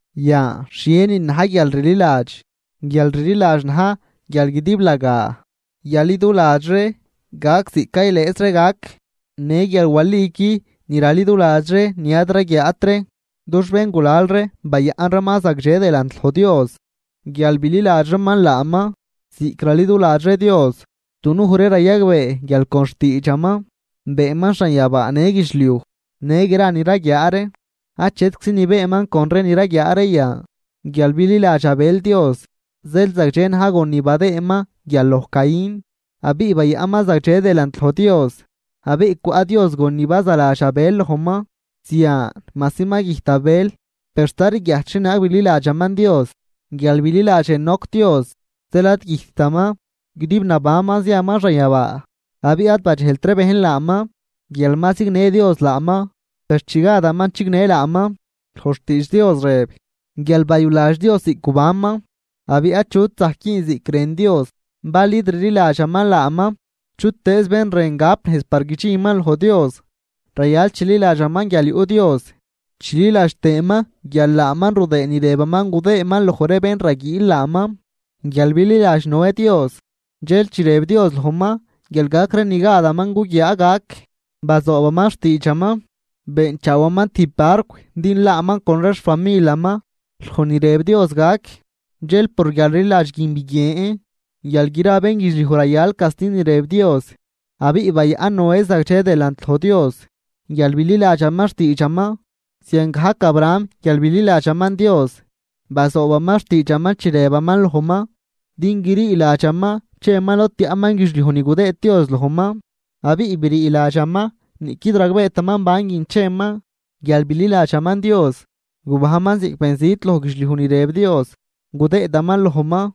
Yan, ¿xhienin na̱j guialrliladx? Guialrliladx na̱j guial guidiblagaa yaliduladx ree gac ziꞌc caylëjz ree gac, në guial waliqui ni raliduladx ree ni ad raguiaat ree. Dux béngulal ree bayaꞌn reeman zagdxe delant loj Dios guial bililadx reeman laaman. Ziꞌc raliduladx ree Dios, dunuj ree rayagbee guial con xtiidxaman beenman xanyabaa në guidxliuj në gra ni raguiaa ree, achetczi ni beenman con ree ni raguiaa ree yan. Guial bililadx Abel Dios, zeel zagdxe na̱j gon ni badëëman guial loj Caín, abiꞌ bayaꞌnman zagdxe delant loj Dios abiꞌ cwaꞌ Dios gon ni bazaladx Abel lojman. Zian majsi ma güjt Abel, per sta rguiajt xhienaag bililadxaman Dios. Guial bililadx Enoc Dios zeel ad güjttaman, guidib nabanman ziaman xanyabaa abiꞌ ad badxejlt ree bejn laaman guial ma zignë Dios laaman. Per chi gadaman chignë laaman, loj xtiidx Dios rëb guial bayuladx Dios ziꞌc gubanman. Abiꞌ achut zajc güün ziꞌc rën Dios bal id rliladxaman laaman. Chutëëz bén rën gap nejz par guidxinman loj Dios rayal chililadxaman guial yuꞌ Dios chililadx tëëman guial laaman rudëë ni rëbaman gudëëman loj ree bén raguiil laaman. Guial bililadx Noé Dios dxel chi rëb Dios lojman guial gac ree ni gadaman guguiaa gac bazoobaman xtiidxaman, beenchaawaman tijb barcw din laaman con ree xfamilaman loj ni rëb Dios gac. Dxel por guialrliladx guin biguien guial gra bénguidxliuj rayal casti ni rëb Dios, abiꞌ bayaꞌn Noé zagdxe delant loj Dios guial bililadxaman xtiidxaman. Ziangajc Abraham guial bililadxaman Dios, bazoobaman xtiidxaman chi rëbaman lojman din grii ladxaman cheman lod tiaꞌman guidxliuj ni gudëëd Dios lojman. Abiꞌ brii ladxaman niꞌquid ragbeetaman banguin cheman. Guial bililadxaman Dios, gubajnman ziꞌc benzit loj guidxliuj ni rëb Dios gudëëdaman lojman.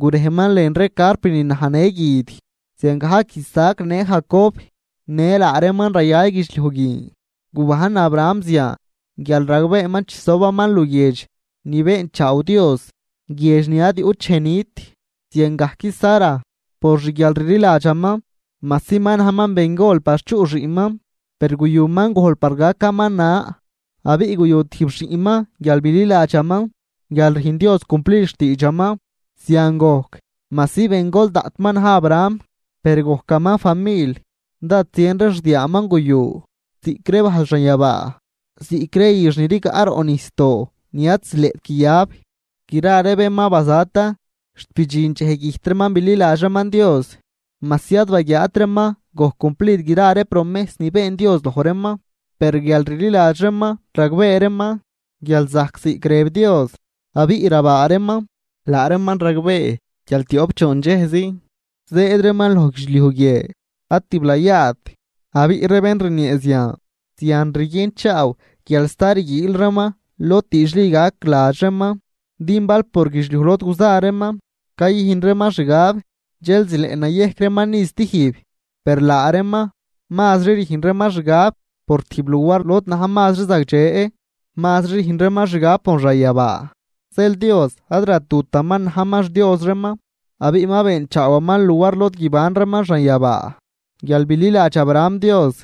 Gurejman lën ree carp ni naj në guid, ziangajc Isaac në Jacob në laa reeman rayal guidxliuj guin. Gubajn Abraham zian guial ragbeeman chisobaman luguiedx ni beenchaaw Dios, guiedx ni ad yuꞌt dxej nit. Ziangajc Sara, por xguialrliladxaman, majsi ma najman bengol par chuꞌ xiꞌnman, per guyuman gojl par gacaman na abiꞌ guyu tijb xiꞌnman guial bililadxaman guial rüjn Dios cumplid xtiidxaman. Zian gojc majsi bengol daꞌt ma na̱j Abraham per gojcaman famil. Dád zien ree xdiaaman guyu ziꞌc ree bajl xanyabaa, ziꞌc ree üx ni rigaꞌ roꞌ nijsdoo ni ad zileꞌt guiyab. Gra ree bén ma bazatan xt bidxin dxej güjt reeman bililadx reeman Dios, majsi ad baguiaat reeman gojc cumplid gra ree promejs ni been Dios loj reeman, per guial rliladx reeman ragbee reeman guial zajc ziꞌc rëb Dios abiꞌ rabaa reeman. Laa reeman ragbee guial tioꞌp choon dxejzi zëëd reeman loj guidxliuj guie ad tiblayaat. Abiꞌ ree bén rniee zian, zian rguienchaaw guial sta rguiil reeman lod diidxli gac ladx reeman. Din bal por guidxliuj lod guza reeman cayüjn reeman xgab, dxel zileꞌ nayejc reeman ni stijb. Per laa reeman mazri rüjn reeman xgab por tijb luar lod na̱j mazri zagdxe, mazri rüjn reeman xgab por xanyabaa. Zeel Dios ad ratutaman najman xDios reeman abiꞌ ma beenchaawaman luar lod guiban reeman xanyabaa. Guial bililadx Abraham Dios,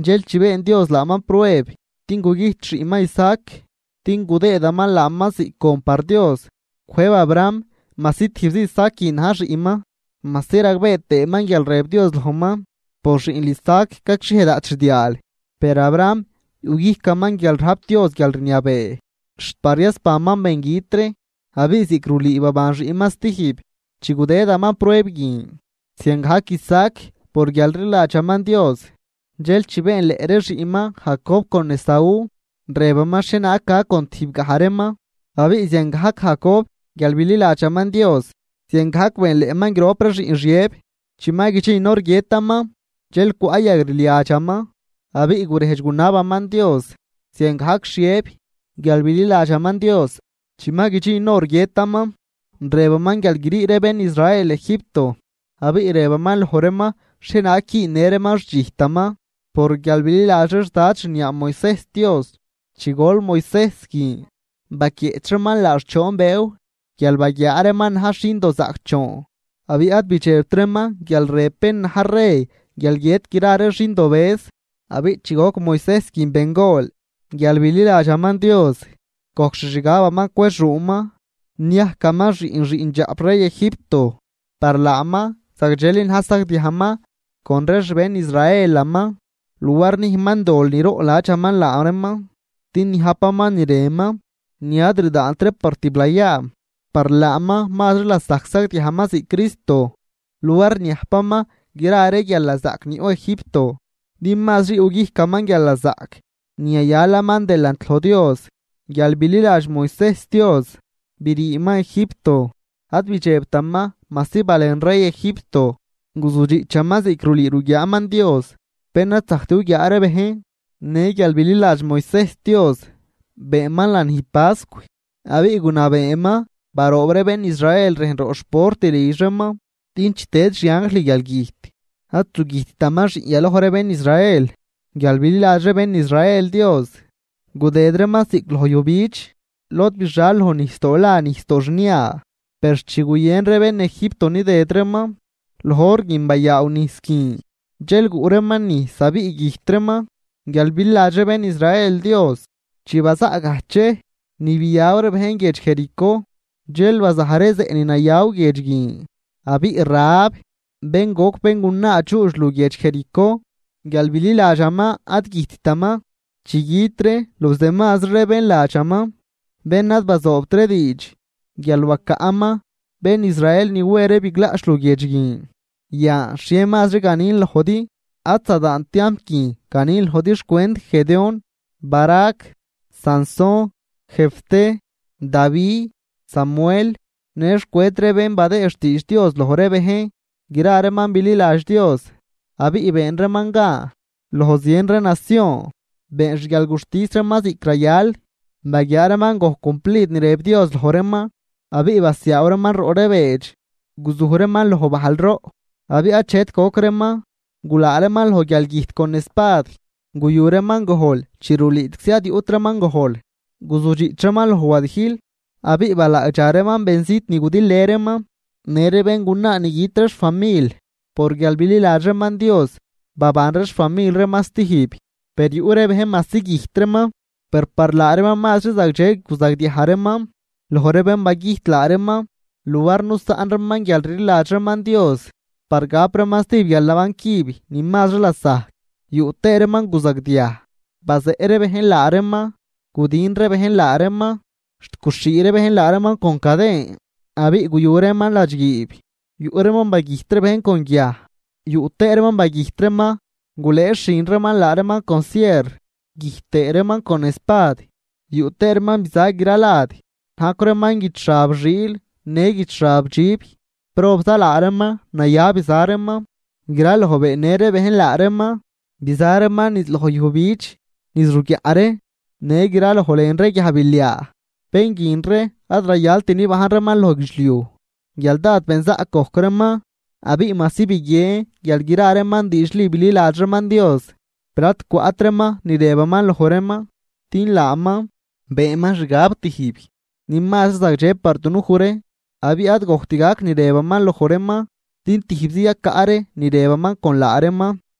dxel chi been Dios laaman prueb din gugüjt xiꞌnman Isaac din gudëëdaman laaman ziꞌc gon par Dios, cwëjb Abraham majsi tijbzi Isaac guin na̱j xiꞌnman, majsi ragbee tëëman guial rëb Dios lojman: “Por xiꞌnl Isaac gacxhiej daꞌt xdiaal.” Per Abraham yuꞌguijcaman guial rajp Dios guialrniabee xt par yasbanman bengüt ree, abiꞌ ziꞌc rulüü baban xiꞌnman stijb chi gudëdaman prueb guin. Ziangajc Isaac por guialrliladxaman Dios dxel chi beenleꞌ ree xiꞌnman Jacob con Esaú, rëbaman xhienaag gac con tijbgaj reeman. Abiꞌ ziangajc Jacob guial bililadxaman Dios ziangajc beenleꞌman grop ree xiꞌn Xiëb chi ma guidxin hor guiëtaman. Dxel cwaꞌ yagrliadxaman abiꞌ gurejdx gunabaman Dios. Ziangajc Xiëb guial bililadxaman Dios, chi ma guidxin hor guiëtaman, rëbaman guial grii ree bén Israel Egipto, abiꞌ rëbaman loj reeman xhienaag güünnë reeman xdxijtaman. Por guial bililadx ree xdad xniaa Moisejs Dios chi gol Moisejs guin, baquieꞌch reeman laax choon bëëw guial baguiaa reeman najx xindozaꞌcdxoon, abiꞌ ad bidxebt reeman guial rëb bén na̱j rey guial guiët gra ree xindobëz. Abiꞌ chi goc Moisejs guin bengol, guial bililadxaman Dios, gojc xixgabaman cwexuuman niajcaman xiꞌn xiꞌndxaꞌp rey Egipto. Par laaman zagdxeli na̱j sagdiajman con ree xbén Israelaman, luar nüjnman dol niroꞌnladxaman laa reeman din niajpaman ni rënman, ni ad rdaant ree par tiblayaa. Par laaman mazri lasajc sagdiajman ziꞌc Cristo luar niajpaman gra ree guialnazaꞌc ni yuꞌ Egipto, din mazri yuꞌguijcaman guialnazaꞌc ni yayalaman delant loj Dios. Guial bililadx Moisejs Dios, briiman Egipto, ad bidxebtaman majsi balen rey Egipto. Guzudxiꞌchaman ziꞌc rulüü ruguiaaman Dios bén ad zajct guguiaa ree bejn. Në guial bililadx Moisejs Dios, beenman lanij pascw, abiꞌ gunabeeman baroob ree bén Israel rejn roꞌ xport lidx reeman, din chi tëd xianjl guialgüjt, ad zugüjttaman xiꞌn yaloj ree bén Israel. Guial bililadx ree bén Israel Dios, gudëd reeman ziꞌc loj yujbidx lod bixal loj nijsdoo la nijsdoo xnia. Per chi guyën ree bén Egipto nidëd reeman, loj hor guin bayaaw nijs guin dxel guꞌ reeman nijs abiꞌ güjt reeman. Guial bililadx ree bén Israel Dios, chi bazaꞌ gajdx dxej ni biaw reeman guiedx Jericó, dxel bazaj zeꞌ ni nayaw guiedx guin. Abiꞌ Rahab bén goc béngunaa dxuudx luguiedx Jericó, guial bililadxaman ad güjttaman chi güt ree los demazri ree bén ladxaman bén ad bazoobt ree diidx, guial bacaꞌman bén Israel ni we ree biglaꞌch luguiedx guin. Yan, ¿xhie mazri ganin lojdi? Ad zadaant tiamp guin ganin lojdi xcwent Gedeón, Barac, Sansón, Jefté, Davi, Samuel në xcwent ree bén badëë xtiidx Dios loj ree bejn. Gra reeman bililadx Dios abiꞌ been reeman gan loj zien ree nacion, been xguialguxtis reeman ziꞌc rayal, baguiaa reeman gojc cumplid ni rëb Dios loj reeman abiꞌ basiaaw reeman roꞌ ree beedx. Guzuj reeman loj bajl roꞌ abiꞌ achet goc reeman, gulaa reeman loj guialgüjt con espad, guyu reeman gojl chi rulüüczi ad yuꞌt reeman gojl, guzudxiꞌch reeman loj wadijl abiꞌ balaagdxa reeman benzit ni gudilë reeman. Në ree béngunaa ni güt ree xfamil, por guial bililadx reeman Dios baban ree xfamil reeman stijb. Per yuꞌ ree bejn majsi güjt reeman, per par laa reeman mazri zagdxe guzagdiaj reeman loj ree bén bagüjt laa reeman, luar nusaꞌn reeman guialrliladx reeman Dios par gap reeman stijb guialnaban cüb ni mazri lasajc. Yuꞌ tëë reeman guzagdiaj bazeꞌ ree bejn laa reeman, gudijn ree bejn laa reeman, xt guxhii ree bejn laa reeman con caden abiꞌ guyu reeman ladxguiib. Yuꞌ reeman bagüjt ree bejn con guiaj, yuꞌ tëë reeman bagüjt reeman gulëëxhün reeman laa reeman con sierr, güjt tëë reeman con espad. Yuꞌ tëë reeman biza gra lad najcw reeman guid xab xiil në guid xab dxib, probza laa reeman naya biza reeman, graloj beennë ree bejn laa reeman. Biza reeman niz loj yujbidx, niz ruguiaꞌ ree, në graloj lën ree guiajbiliaa. Bén guin ree ad rayal nibajn reeman loj guidxliuj guial dád benzaꞌc gojc reeman. Abiꞌ majsi biguien guial gra reeman diidxli bililadx reeman Dios, per ad cwaꞌt reeman ni rëbaman loj reeman. Din laaman beenman xgab tijb ni mazri zagdxe par dunuj ree, abiꞌ ad gojc gajt ni rëbaman loj reeman din tijbzi yacaꞌ ree ni rëbaman con laa reeman.